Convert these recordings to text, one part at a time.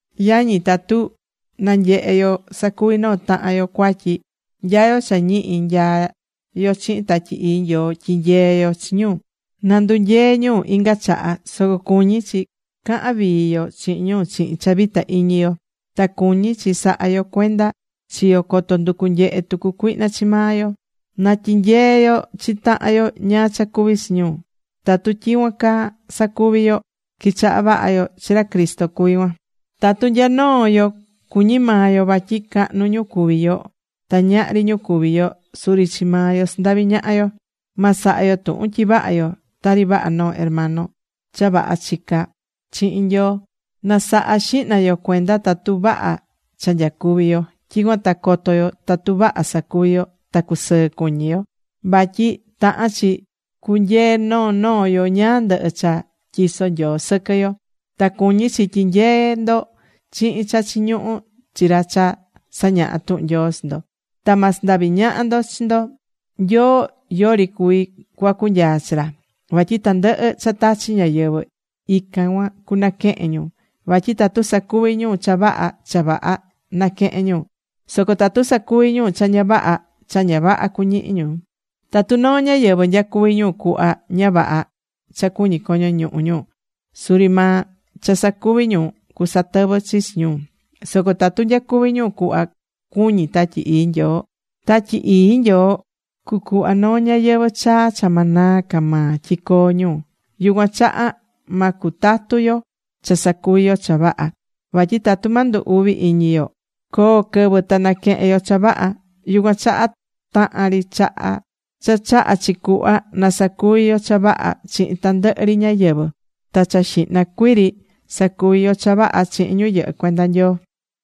Yañi, tatu nanyehé yo sacuví noo tahan yo cuatyi. Nya yo cha ñihi nyaá yo chihin Tatyi Ii Nyoo tyi̱nyee yo chi ñu na ndunyee ñu inga chaha. Soco cuñí chi cahán vii yo chihin ñu chihin cha vita iñi yo. Ta cuñí chi sahá yo cuenda chi yo coto nducu nyehe tucu cuihna chi maa yo. Na tyinyee yo chi tahan yo ñáá cha cuví chi ñu. Tatu tyicuan caa sacuví yo, quichahá vaha yo chi ra Cristo cuví cuan. Tatu nya noo yo cuñí maa yo vatyi cahnu ñu cuví yo, ta ñahri ñu cuví yo, suri chi maa yo sandaví ñaha yo. Ma saha yo tuhun tyi vaha yo tari vaha noo hermano cha vaha chicá chihin Nyoo. Nasaha xihna yo cuenda tatu vaha cha nyacuví yo. Tyicuan ta coto yo tatu vaha sacuví yo ta cusɨɨ cuñi yo. Vatyi tahán chi cunyee noo noo yo ñáá ndɨhɨ cha tyisó Nyoo sɨquɨ yo. Ta cuñí chi tyinyeé ndo chihin cha chiñuhú chi ra cha sañahá tuhun Nyoo chi ndo. Ta ma sandavi ñaha ndo chi ndo. Nyoo yori cuví cuacu nyaa chi ra. Vatyi tandɨhɨ cha tachí ñáyɨvɨ, ican cuan cunaquehén ñu. Vatyi tatu sacuví ñu cha vaha, cha vaha naquehén ñu. Soco tatu sacuví ñu cha ña vaha, cha ña vaha cuñihi ñu. Tatu noo ñáyɨvɨ nyacuví ñu cuhva ña vaha cha cuñí coño ñuhu ñu, suri maa cha sacuví ñu cusatɨvɨ chi chi ñu. Soco tatu nyacuví ñu cuhva cuñí Tatyi Ii Nyoo, Tatyi Ii Nyoo cucuhva noo ñayɨvɨ̱ chaa cha ma naa ca maa tyi coo ñu. Yucuan chaha ma cutatu yo cha sacuví yo cha vaha. Vatyi tatu ma ndu uvi iñi yo, coo quɨvɨ ta naquehen yo cha vaha. Yucuan chaha tahan ri chaha cha chahá chi cuhva, na sacuvi yo cha vaha chihin tandɨhɨ ri ñáyɨvɨ. Ta cha xihna cuii ri sacuvi yo cha vaha chihin ñu yɨhɨ́ cuenda Nyoo.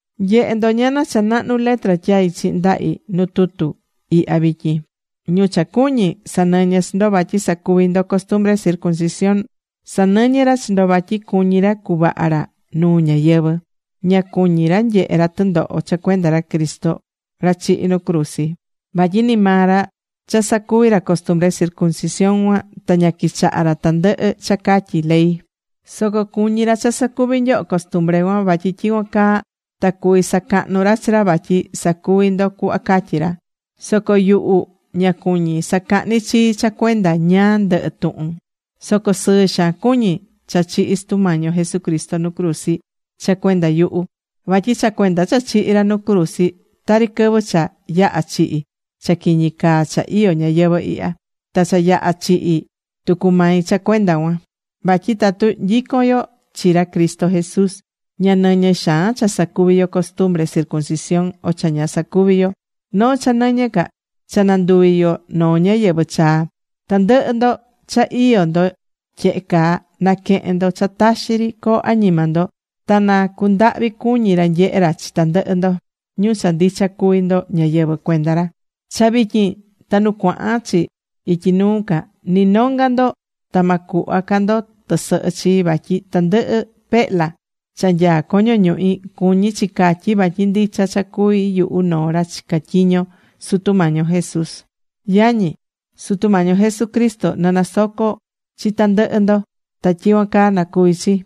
Nye̱he ndo ñana cha nahnu letra tyaí chihin ndahi nu tutu ihya vityin. Ñu cha cuñí sanɨñɨ́ chi ndo vatyi sacuvi ndo costumbre circuncisión, sanɨñɨ́ ra chi ndo vatyi cuñí ra cuvaha ra nuu ñáyɨvɨ. Ña cuñí ra nyehe ra tɨndoho cha cuenda ra Cristo, ra chihi̱ nu cruzi. Vatyi ni maa ra cha sacuvi̱ ra costumbre circuncisión cuan ta ña quichahá ra tandɨhɨ cha catyí ley. Soco cuñí ra cha sacuvi nyoho costumbre cuan. Vatyi tyicuan caa ta cuví sacahnu ra chi ra vatyi sacuví ndo cuhva catyí ra. Soco yuhu ña cuñí sacahni chii cha cuenda ñáá ndɨhɨ tuhun. Soco sɨɨ xaan cuñí cha chihi̱ Sutu Mañi yo Jesucristo nu cruzi cha cuenda yuhu. Vatyi cha cuenda cha chihi̱ ra nu cruzi, tari quɨvɨ cha yaha̱ chihi̱ cha quiñi caa cha iyó ñayɨvɨ̱ ihya. Ta cha yaha̱ chihi̱ tucu mai cha cuenda cuan. Vatyi tatu nyicón yo chi ra Cristo Jesús, ña nɨñɨ xaan cha sacuvi̱ yo costumbre circuncisión o cha ña sacuvi̱ yo. Noo cha nɨñɨ ca, cha nanduví yo noo ñáyɨvɨ chaa. Tandɨhɨ ndo cha iyó ndo tyehe caa, na̱quehen ndo cha taxi ri coo añima ndo. Ta na cundahvi cuñi ra nyehe ra chi tandɨhɨ ndo, ñu cha ndicha cuví ndo ñáyɨvɨ cuenda ra. Cha vityin ta nu cuahán chi ityi nuu ca, ni nonga ndo ta ma cuhva ca ndo tɨsɨhɨ chii. Vatyi tandɨhɨ pehla cha nyaá coño ñuhi, cuñí chi catyi vatyi ndicha cha cuví yuhu noo ra chicá tyiño Sutu Mañi yo Jesús. Yañi, Sutu Mañi yo Jesucristo na nasoco chi tandɨhɨ ndo. Ta tyicuan caa na cuvi chi.